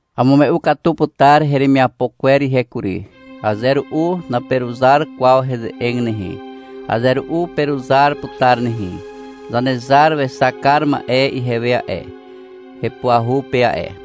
Amume'u katu putar heremiapo kwer ihe kury. Aze ru'u naperuzar kwaw heze'eg nehe. Aze ru'u peruzar putar nehe. Zanezar wexak kar ma'e ihewe a'e, hepuahu pe a'e.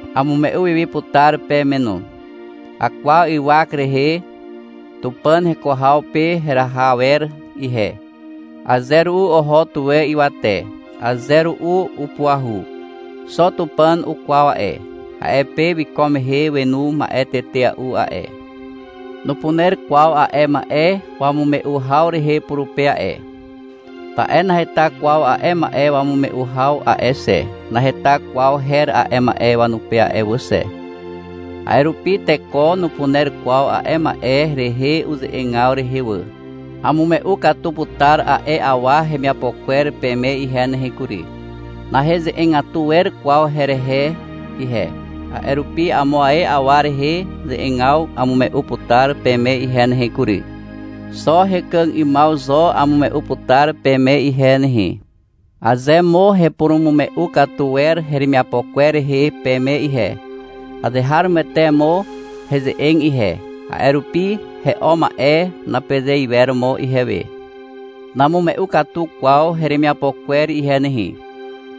Amume'u wi wi putar peme no. Akwaw ywak rehe Tupàn heko haw pe heraha awer ihe. (Aze ru'u oho tuwe ywate, aze ru'u upuahu. Xo Tupàn ukwaw a'e.) A'e pe wiko mehe wenu ma'e tetea'u a'e. Nupuner kwaw a'e ma'e wamume'u haw rehe purupe a'e, ta'e naheta kwaw a'e ma'e wamume'u haw a'e xe, naheta kwaw her a'e ma'e wanupe a'e wà xe. A'e rupi teko nupuner kwaw a'e ma'e rehe uze'egaw rehe wà. Amume'u katu putar a'e awa hemiapo kwer peme ihe nehe kury. Naheze'egatu wer kwaw herehe ihe, a'e rupi amo ae awa rehe ze'egaw amume'u putar peme ihe nehe kury. Xo hekàg 'ymaw zo amume'u putar peme ihe nehe. Aze mo hepurumume'u katu wer heremiapo kwer rehe peme ihe, azeharomoete mo heze'eg ihe. A'e rupi — He'o ma'e, napeze iwer mo ihewe. Namume'u katu kwaw heremiapo kwer ihe nehe.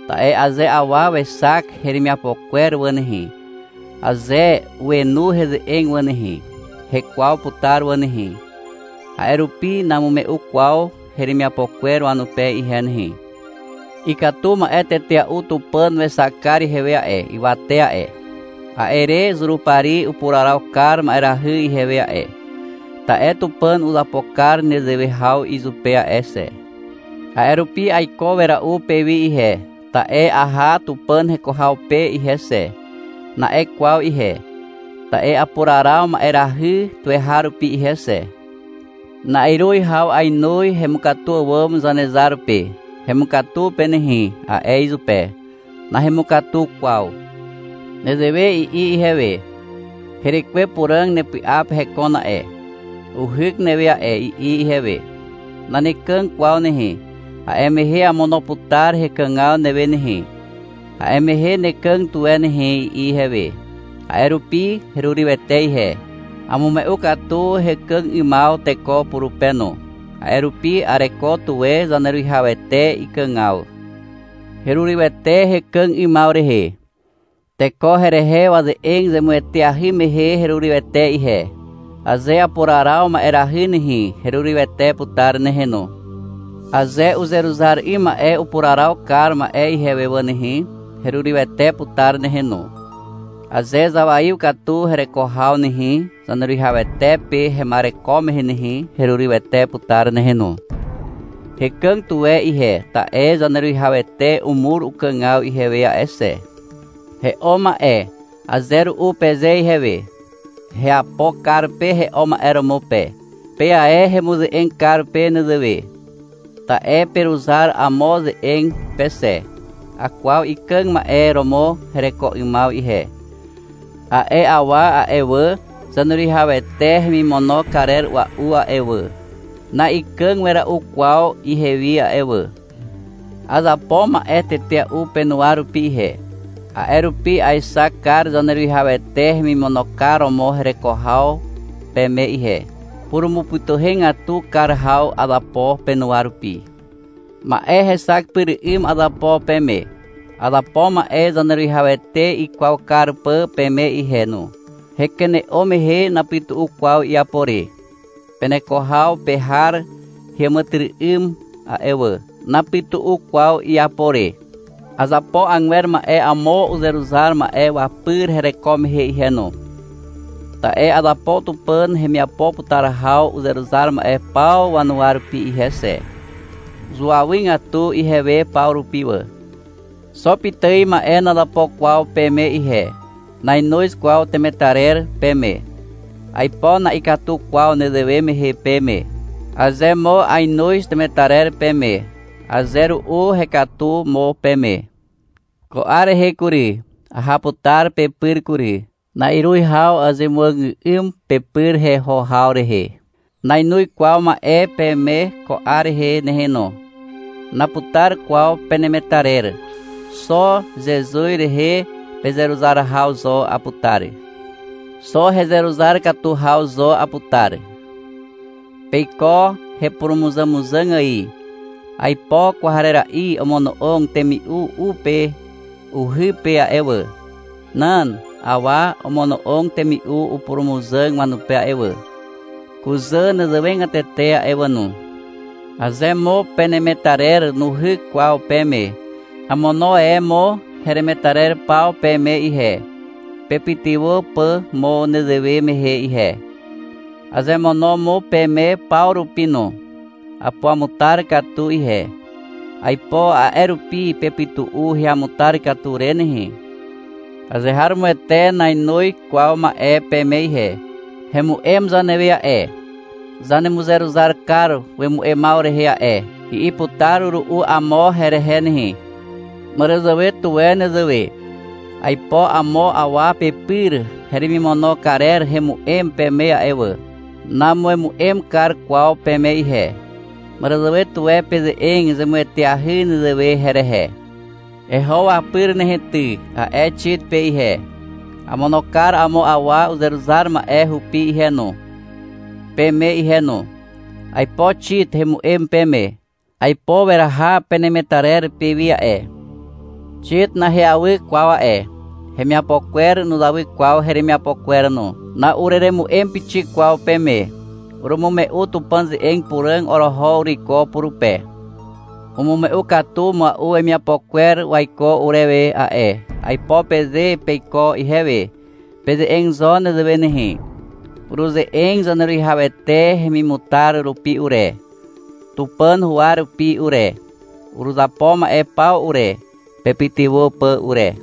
Ta'e aze awa wexak heremiapo kwer wà nehe, aze wenu heze'eg wà nehe, hekwaw putar wà nehe. A'e rupi namume'u kwaw heremiapo kwer wanupe ihe nehe. Ikatu ma'e tetea'u Tupàn wexak kar ihewe a'e, ywate a'e. A'e re Zurupari upuraraw kar ma'erahy ihewe a'e. Ta'e Tupàn uzapo kar nezewe haw izupe a'e xe. A'e rupi — Aiko wera'u pewi ihe, ta'e aha Tupàn heko haw pe ihe xe, na'e kwaw ihe. Ta'e apuraraw a'e ma'erahy tuweharupi ihe xe. Na'iruz haw ainoz hemukatu àwàm Zanezar pe. — Hemukatu pe nehe, a'e izupe. Nahemukatu kwaw. Nezewe i'i ihewe. — Herekwe Puràg nepy'a pe hekon a'e, uhyk newe a'e, i'i ihewe. Nanekàg kwaw nehe, a'e mehe amono putar hekàgaw newe nehe. A'e mehe nekàg tuwe nehe, i'i ihewe. A'e rupi herurywete ihe. Amume'u katu hekàg 'ymaw teko purupe no. A'e rupi areko tuwe Zaneruwihawete ikàgaw. Herurywete hekàg 'ymaw rehe. Teko herehe waze'eg zemueteahy mehe herurywete ihe. Aze apuraraw ma'erahy nehe, herurywete putar nehe no. Aze uzeruzar 'ym ma'e upuraraw kar ma'e ihewe wà nehe, herurywete putar nehe no. Aze zawaiw katu hereko haw nehe, Zaneruwihawete pe hema'ereko mehe nehe, herurywete putar nehe no. Hekàg tuwe ihe, ta'e Zaneruwihawete umur ukàgaw ihewe a'e xe. — He'o ma'e, aze ru'u peze ihewe. Heapo kar pe he'o ma'e romo pe. Pe ae hemuze'eg kar pe nezewe, ta'e peruzar amo ze'eg pe xe. Akwaw ikàg ma'e romo hereko 'ymaw ihe. A'e awa a'e wà, Zaneruwihawete hemimono karer a'ua'u a'e wà, na'ikàg wera'u kwaw ihewi a'e wà. Azapo ma'e tetea'u penuwa rupi ihe, a'e rupi aexak kar Zaneruwihawete hemimono kar romo hereko haw peme ihe. Purumupytuhegatu kar haw azapo penuwa rupi. Ma'e hexak pyr 'ym azapo peme. Azapo ma'e Zaneruwihawete ikwaw kar pà peme ihe no. Hekene'o mehe napytu'u kwaw iapo re. Peneko haw pe har heàmàtyry'ym a'e wà. Napytu'u kwaw iapo re. Azapo agwer ma'e amo uzeruzar ma'e wapyr hereko mehe ihe no. Ta'e azapo Tupàn hemiapo putar haw uzeruzar ma'e paw wanuwa rupi ihe xe. Zuawygatu ihewe paw rupi wà. Xo pitài ma'e nazapo kwaw peme ihe. Nainoz kwaw temetarer peme. Aipo na'ikatu kwaw nezewe mehe peme. Aze mo ainoz temetarer peme, aze ru'u hekatu mo peme. Ko 'ar rehe kury, aha putar pepyr kury. Na'iruz haw azemuàgà'ym pepyr heho haw rehe. Nainoz kwaw ma'e peme ko 'ar rehe nehe no. Naputar kwaw penemetarer. Xo Zezuz rehe pezeruzar haw zo aputar. Xo heruzar katu haw zo aputar. Peiko hepurumuzàmuzàg ài. Aipo kwarera'i omono'og temi'u u pe uhy pe a'e wà. Nan. Awa omono'og temi'u upurumuzàg wanupe a'e wà. Kuzà nezewegatete a'e wà no. Aze mo penemetarer nuhyk kwaw peme, amono e mo heremetarer paw peme ihe, pepytywà pà mo nezewe mehe ihe. Azemono mo peme paw rupi no. Apuamutar katu ihe. Aipo a'e rupi pepytu'u heamutar katu re nehe. Azeharomoete nainoz kwaw ma'e peme ihe. — Hemu'em zanewe a'e, zanemuzeruzar kar wemu'emaw rehe a'e, i'i putar ru'u amo herehe nehe. Màràzàwe tuwe nezewe. Aipo amo awa pepyr heremimono karer hemu'em peme a'e wà. Namuemu'em kar kwaw peme ihe. Màràzàwe tuwe peze'eg zemueteahy nezewe herehe. — Eho wapyr nehe ty, a'e Xit pe ihe. Amono kar amo awa uzeruzar ma'e hupi ihe no, peme ihe no. Aipo Xit hemu'em peme. Aipo weraha penemetarer pewi a'e. Xit naheawy kwaw a'e. Hemiapo kwer nuzawy kwaw heremiapo kwer no. Na'ureremu'em pixik kwaw peme. Urumume'u Tupàn ze'eg puràg oroho uruiko purupe. — Umume'u katu mua'u wemiapo kwer waiko urewe a'e, aipo peze peiko ihewe. Peze'eg zo nezewe nehe. Uruze'eg Zaneruwihawete hemimutar rupi ure, Tupàn huwa rupi ure. Uruzapo ma'e paw ure, pepytywà pà ure.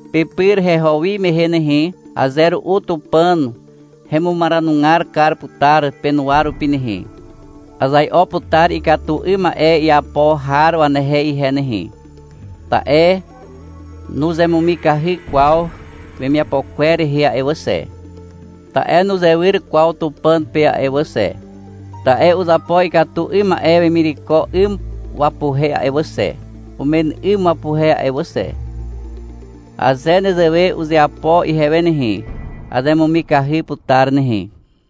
Pepyr heho wi mehe nehe, aze ru'u Tupàn hemumaranugar kar putar penuwa rupi nehe. Azai'o putar ikatu 'ym ma'e iapo har wanehe ihe nehe, ta'e nuzemumikahy kwaw wemiapo kwer rehe a'e wà xe. Ta'e nuzewyr kwaw Tupàn pe a'e wà xe. Ta'e uzapo ikatu 'ym ma'e wemireko 'ym wapuhe a'e wà xe, umen 'ym wapuhe a'e wà xe. Aze nezewe uzeapo ihewe nehe, azemumikahy putar nehe.